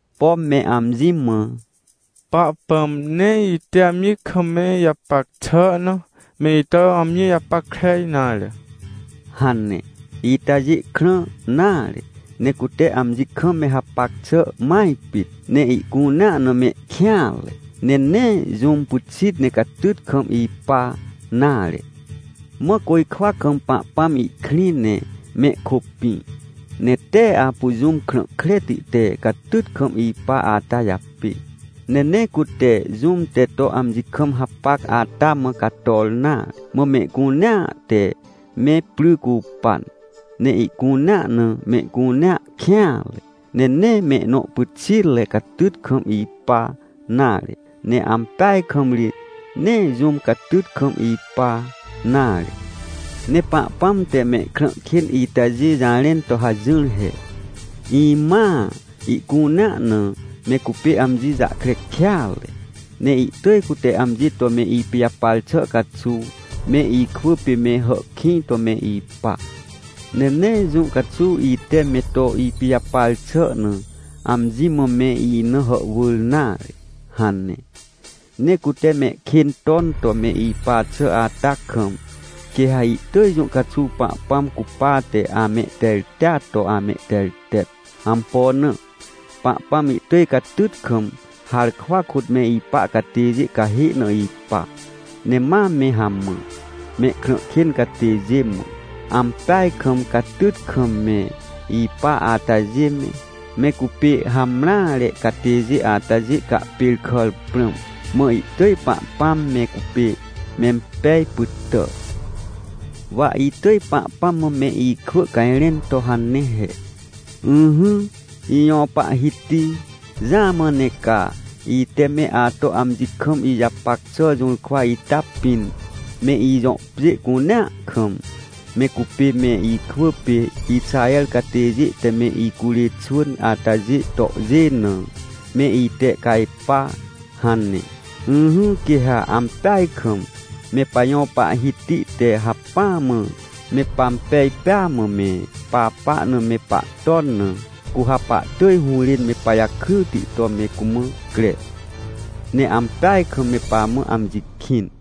Pom me amji mã: “Pahpãm nee ite amji kam me ijapac xà na, me ito amji japackre nare” hane. Itajê krã nare, ne cute amji kam me hapac xà maj pit. Ne ihcunea na mehkêanre. Ne nee jũm pyxit ne catyt kam ipa nare. Mã côjkwa kam Pahpãm ihkrĩ ne mehkôpĩ, ne tee apu jũm krã kreti te catyt kam ipa ata japê, ne nee cute jũm te to amji kam hapac ata mã cator nare. Mã mehcunea te me pry cupan, ne ihcunea na mehcunea kêanre, ne nee mehnõ pyxitre catyt kam ipa nare. Ne ampeaj kam ri, nee jũm catyt kam ipa nare! Ne Pahpãm te mehkrã kên itajê jarẽn to hajỹr he: “Imãa ihcunea na me cupê amji jahkre kêatre! Ne ihtỳj cute amji to me ipijapar xà caxuw, me ikwỳ pê me hàhkĩj to me ipa, ne nee jũ caxuw ite me to ipijapar xà na, amji mã me ina hàhwỳr nare” hane. Ne cute mehkên ton to me ipa xà ata kam, quê ha ihtỳj jũ caxuw Pahpãm cupate, amehterteat to amehtertet. Ampo na? Pahpãm ihtỳj catyt kam harkwa kôt me ipa catêjê cahê na ipa, ne ma me hamã. Mehkrã kên catêjê mã, ampeaj kam catyt kam me ipa atajê me, me cupê hamreare catêjê atajê cahpêrkàr prãm, mã ihtỳj Pahpãm me cupê mempej pytà. Wa itỳj Pahpãm mã me ikwỳ cajrẽn to hane he: “Ỹhỹ, ijõ Pahhiti. Jamã ne ca, ite me ato amji kam ijapac xà jũrkwa ita pĩn, me ijõ pjê cunea kam, me cupê me ikwỳ pê Ixaher catêjê te me icurê xwỳn atajê tohjê na, me itehcajpa” hane. Ỹhỹ, quê ha ampeaj kam me pajõ Pahhiti te hacpỹ mã me pampej pêa mã me papa na me pahton na, cu ha pahtỳj hũrên me pajakryti to me cumã cre, ne ampeaj kam me pamã amji kĩn.